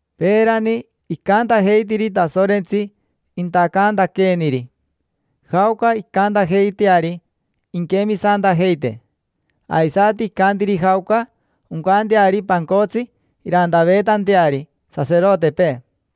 Peerani icantajeitiri Tasorentsi intacantaqueeniri jaoca incantajeiteari inquemisantajeite, aisati icantiri jaoca oncanteari pancotsi irantaveetanteari saserotepee.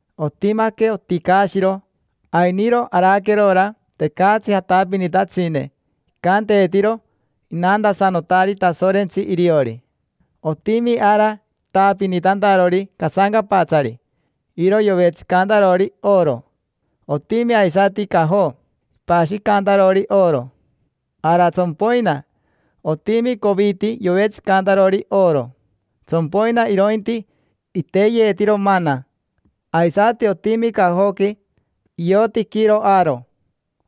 Otimaque oticaashiro, ainiro araquerora tecatsi jatapinitatsine, icanteetiro inantasanotari Tasorentsi iriori. Otimi ara itaapinitantarori casancapatsari, iro yovetsicantarori oro. Otimi aisati cajo, ipashicantarori oro. Ara tsompoina, otimi coviti yovetsicantarori oro, tsompoina irointi iteyeetiro mana. Aisati otimi cajoqui iotiquiro Aaro,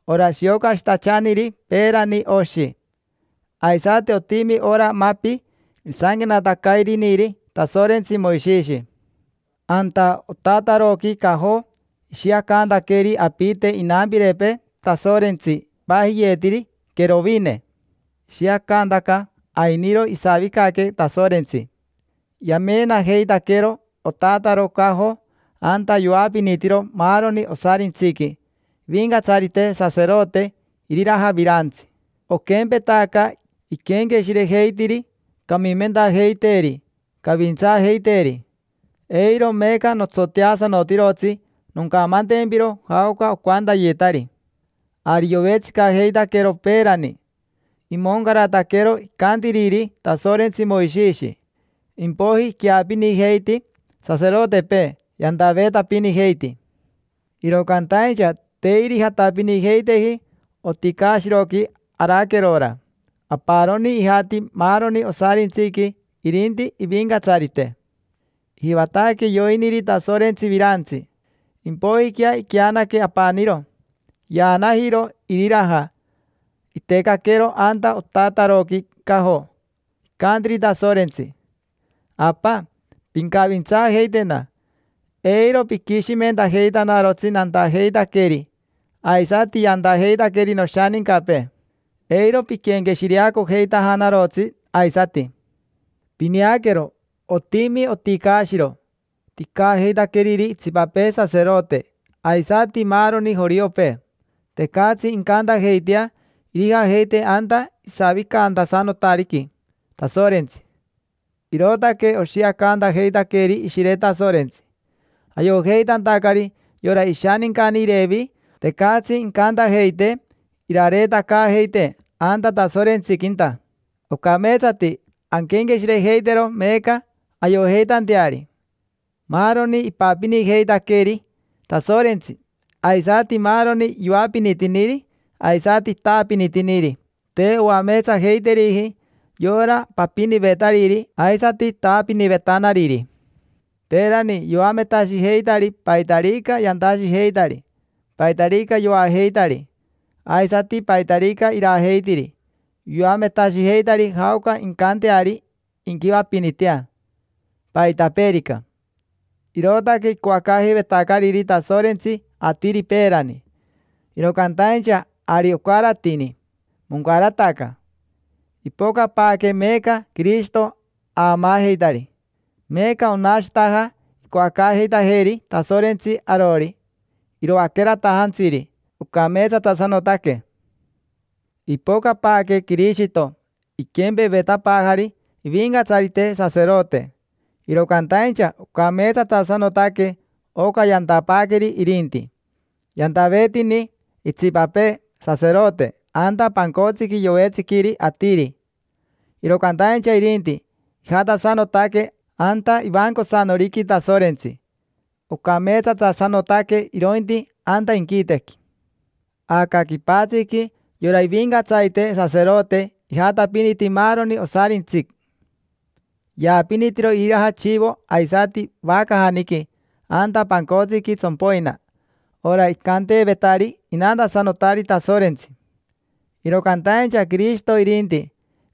ora shiocashitachaniri peerani oshi. Aisati otimi ora mapi isanquenatacairiniri Tasorentsi Moishishi. Anta otataroqui cajo ishiacantaqueri apite inampirepee Tasorentsi ipajiyeetiri querovine. Ishiacantaca ainiro isavicaque Tasorentsi. Yamenajeitaquero otataro cajo anta yoapinitiro maaroni osarintsiqui ivincatsarite saserote iriraja virantsi. Oquempetaca iquenqueshirejeitiri camimentajeiteeri, cavintsaajeiteeri. Eiro meeca notsoteasanotirotsi noncamantempiro jaoca ocantayetari. Ari yovetsicajeitaquero peerani, imoncarataquero icantiriri Tasorentsi Moishishi. Impoiji iqueapinijeiti saserotepee, yantaveetapinijeiti. Iro cantaincha te irijatapinijeiteji oticaashiroqui araquerora. Aparoni ijati maaroni osarintsiqui irinti ivincatsarite. Ijivataque yoiniri Tasorentsi virantsi, impoijiquea iqueanaque apaniro, yaanajiro iriraja, itecaquero anta otataroqui cajo; icantiri Tasorentsi: “Apa, pincavintsaajeitena, eiro piquishimentajeitanarotsi nantajeitaqueri aisati yantajeitaqueri noshanincapee; eiro piquenqueshireacojeitajanarotsi aisati”. Pineaquero, otimi oticaashiro, ticaajeitaqueriri itsipapee saserote aisati maaroni joriopee. Tecatsi incantajeitea irijajeite anta isavicantasanotariqui Tasorentsi. Irootaque oshiacantajeitaqueeri Ishire Tasorentsi, ayojeitantacari yora ishanincani Irevi tecatsi incantajeitee irareetacaajeitee anta Tasorentsiquinta. Ocameetsati anquenqueshirejeitero meeca ayojeitanteari: maaroni ipapinijeitaqueri Tasorentsi, aisati maaroni yoapinitiniri aisati itaapinitiniri, te oameetsajeiteriji yora papinivetariri aisati taapinivetanariri. Peerani yoametashijeitari paitarica yantashijeitari; paitarica yoajeitari, aisati paitarica irajeitiri; yoametashijeitari jaoca incanteari inquivapinitea, paitapeerica. Irootaque icoacaajeivetacariri Tasorentsi atiri peerani. Iro cantaincha ari ocaratini, moncarataca. Ipocapaaque meeca Quirishito aamaajeitari. Meeca onashitaja icoacaajeitajeeri Tasorentsi arori, iroaqueratajantsiri, ocameetsatasanotaque. Ipocapaaque Quirishito iquempevetapaajari ivincatsarite saserote, iro cantaincha ocameetsatasanotaque oca yantapaaqueri irinti. Yantaveetini itsipapee saserote anta pancotsiqui yovetsiquiri atiri; iro cantaincha irinti, ijatasanotaque anta ivancosanoriqui Tasorentsi: ocameetsatasanotaque irointi anta inquitequi. Aca quipatsiqui yora ivincatsarite saserote ijatapiniti maaroni osarintsi, yaapinitiro iriraja chivo aisati vacajaniqui anta pancotsiqui tsompoina, ora icanteevetari inantasanotari Tasorentsi. Iro cantaincha Quirishito irinti,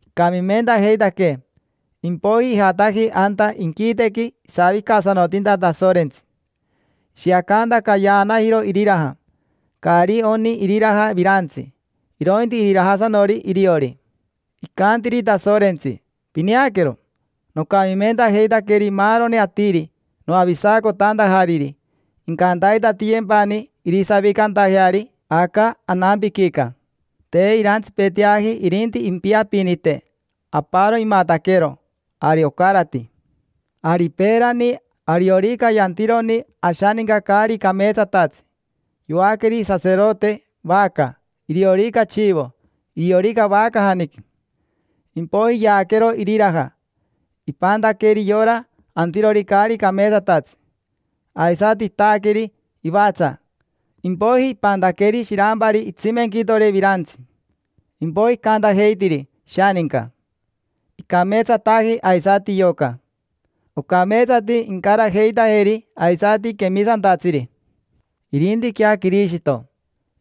icamimentajeitaquee, impoiji ijataji anta inquitequi isavicasanotinta Tasorentsi. Ishiacantaca yaanajiro iriraja: caari oni iriraja virantsi, irointi irirajasanori iriori. Icantiri Tasorentsi: “Pineaquero, nocamimentajeitaqueri maaroni atiri noavisacotantajariri, incantaitatiyempani irisavicantajeari aca anampiquica”. Te irantsipeteaji irinti impiapinite, aparo imataquero, ari ocarati. Ari peerani ariorica yantironi ashaninca caari cameetsatatsi, yoaqueri saserote vaca, iriorica chivo, iriorica vacajaniqui. Impoiji yaaquero iriraja, ipantaqueri yora antirori caari cameetsatatsi. Aisati itaaqueri ivatsa, impoiji ipantaqueri shirampari itsimenquitore virantsi. Impoiji icantajeitiri ishaninca: “Icameetsataji aisati yoca. Ocameetsati incarajeitajeri aisati quemisantatsiri”. Irintiquea Quirishito,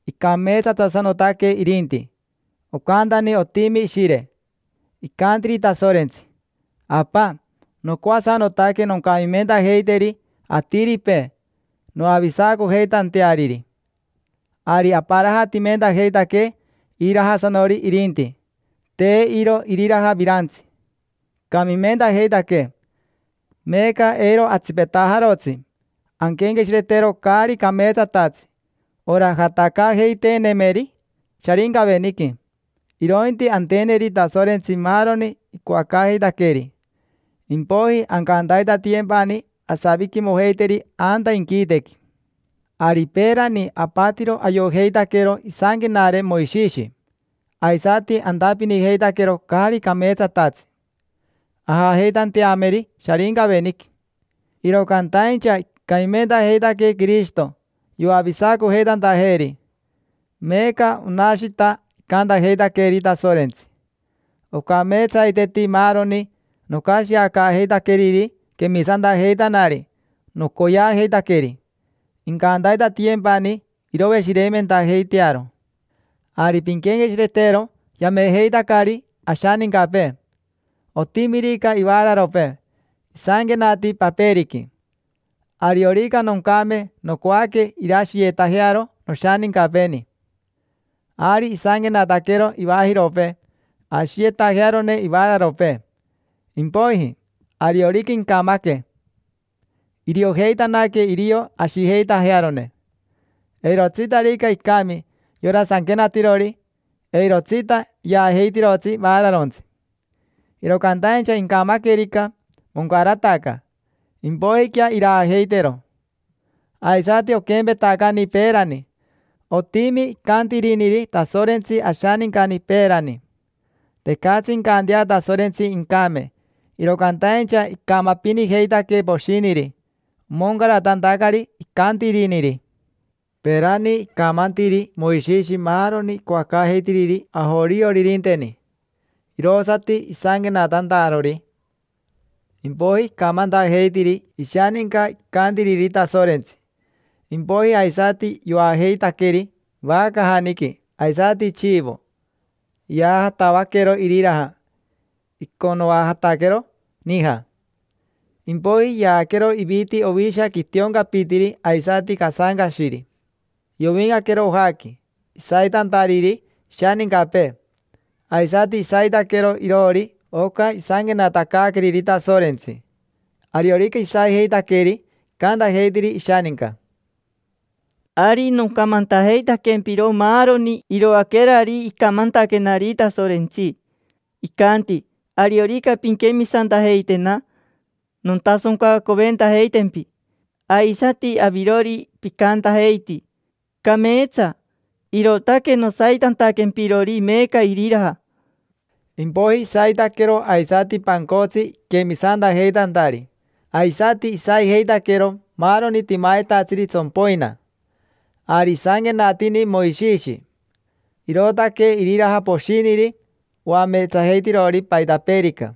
icameetsatasanotaque irinti, ocantani otimi ishire. Icantiri Tasorentsi: “Apa, nocoasanotaque noncamimentajeiteri atiripee, noavisacojeitanteariri”. Ari aparajatimentajeitaquee irirajasanori irinti, te iro iriraja virantsi: icamimentajeitaquee, meeca eiro atsipetajarotsi anquenqueshiretero caari cameetsatatsi, ora jatacaajeiteenemeri Sharincaveniqui, irointi anteneri Tasorentsi maaroni icoacaajeitaqueeri. Impoiji ancantaitatiyempani asaviquimojeiteri anta inquitequi. Ari peerani apatiro ayojeitaquero isanquenare Moishishi, aisati antapinijeitaquero caari cameetsatatsi, ajajeitanteameri Sharincaveniqui; iro cantaincha icamimentajeitaquee Quirishito, yoavisacojeitantajeeri. Meeca onashita icantajeitaqueeri Tasorentsi: “Ocameetsaiteti maaroni nocashiacaajeitaqueriri quemisantajeitanari nocoyeajeitaqueri. Incantaitatiyempani iroveshireimentajeitearo”. Ari pinquenqueshiretero yamejeitacari ashanincapee. Otimirica ivaararopee, isanquenati paperiqui: “Ariorica noncame nocoaque irashiyetajearo noshanincapeeni”. Ari isanquenataquero ivajiropee ashiyetajearone ivaararopee. Impoiji, ariorica incamaque, iriojeitanaque irio ashijeitajearone. Eirotsitarica icami yora sanquenatirori, eirotsita yaajeitirotsi vaararontsi. Iro cantaincha incamaquerica, moncarataca: impoijiquea iraajeitero. Aisati oquempetacani peerani: otimi icantiriniri Tasorentsi ashanincani peerani. Tecatsi incantea Tasorentsi incame, iro cantaincha icamapinijeitaque poshiniri omoncaratantacari icantiriniri. Peerani icamantiri Moishishi maaroni icoacaajeitiriri ajorioririnteni, irosati isanquenatantarori. Impoiji icamantajeitiri ishaninca icantiriri Tasorentsi; impoiji aisati yoajeitaqueri vacajaniqui aisati chivo, yaajatavaquero iriraja, iconoajataquero nija. Impoiji yaaquero iviti ovisha quitioncapitiri aisati casancashiri, yovincaquero ojaqui, isaitantariri ishanincapee. Aisati isaitaquero iroori oca isanquenatacaaqueriri Tasorentsi. Ariorica isaijeitaqueri, icantajeitiri ishaninca: “Ari nocamantajeitaquempiro maaroni iroaquerari icamantaquenari Tasorentsi. Icanti: ‘Ariorica pinquemisantajeitena, nontasoncacoventajeitempi’. Aisati avirori picantajeiti: ‘Cameetsa’. Irootaque nosaitantaquempirori meeca iriraja”. Impoiji isaitaquero aisati pancotsi iquemisantajeitantari, aisati isaijeitaquero maaroni timayetatsiri tsompoina. Ari isanquenatini Moishishi: “Irootaque iriraja poshiniri oameetsajeitirori paitapeerica;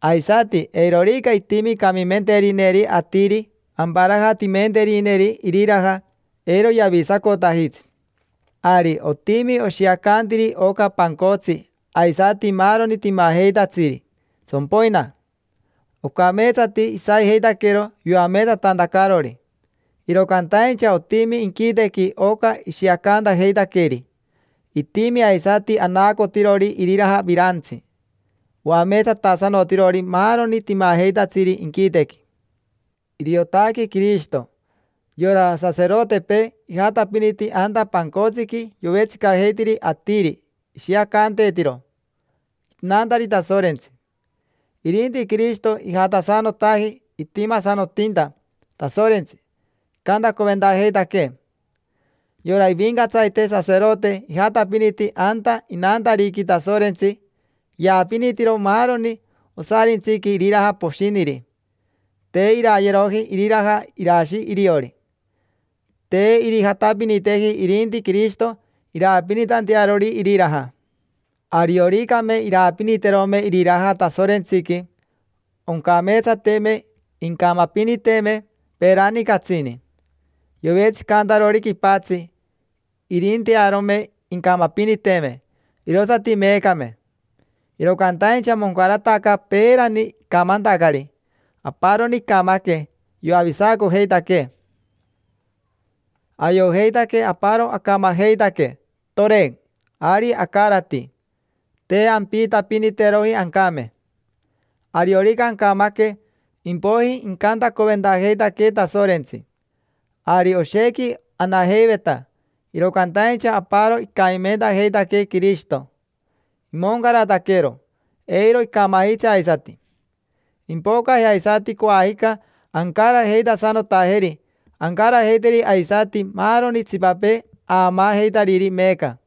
aisati eirorica itimi camimenterineri atiri, amparajatimenterineri iriraja, eiro yavisacotajitsi”. Ari otimi oshiacantiri oca pancotsi aisati maaroni timajeitatsiri tsompoina. Ocameetsati isaijeitaquero yoameetsatantacarori. Iro cantaincha otimi inquitequi oca ishiacantajeitaqueri, itimi aisati anaacotirori iriraja virantsi, oameetsatasanotirori maaroni timajeitatsiri inquitequi: iriotaque Quirishito. Yora saserotepee ijatapiniti anta pancotsiqui yovetsicajeitiri atiri, ishiacanteetiro: “Inantari Tasorentsi”. Irinti Quirishito ijatasanotaji itimasanotinta Tasorentsi, icantacoventajeitaquee. Yora ivincatsarite saserote ijatapiniti anta inantariqui Tasorentsi, yaapinitiro maaroni osarintsiqui iriraja poshiniri: te irayeroji iriraja irashi iriori. Te irijatapiniteji irinti Quirishito iraapinitantearori iriraja. Arioricame iraapiniterome iriraja Tasorentsiqui, oncameetsateme incamapiniteme, peerani catsini: yovetsicantarori quipatsi, irintearome incamapiniteme, irosati meecame. Iro cantaincha moncarataca peerani icamantacari: aparoni icamaque, yoavisacojeitaquee. Ayojeitaque aparo acamajeitaque, toren, ari acarati; te ampiitapiniteroji ancame. Ariorica ancamaque, impoiji incantacoventajeitaquee Tasorentsi. Ari oshequi anajeiveta, iro cantaincha aparo icamimentajeitaquee Quirishito; imoncarataquero, eiro icamajitsi aisati. Impocaje aisati coajica ancarajeitasanotajeri, ancarajeiteri aisati maaroni itsipapee aamaajeitariri meeca.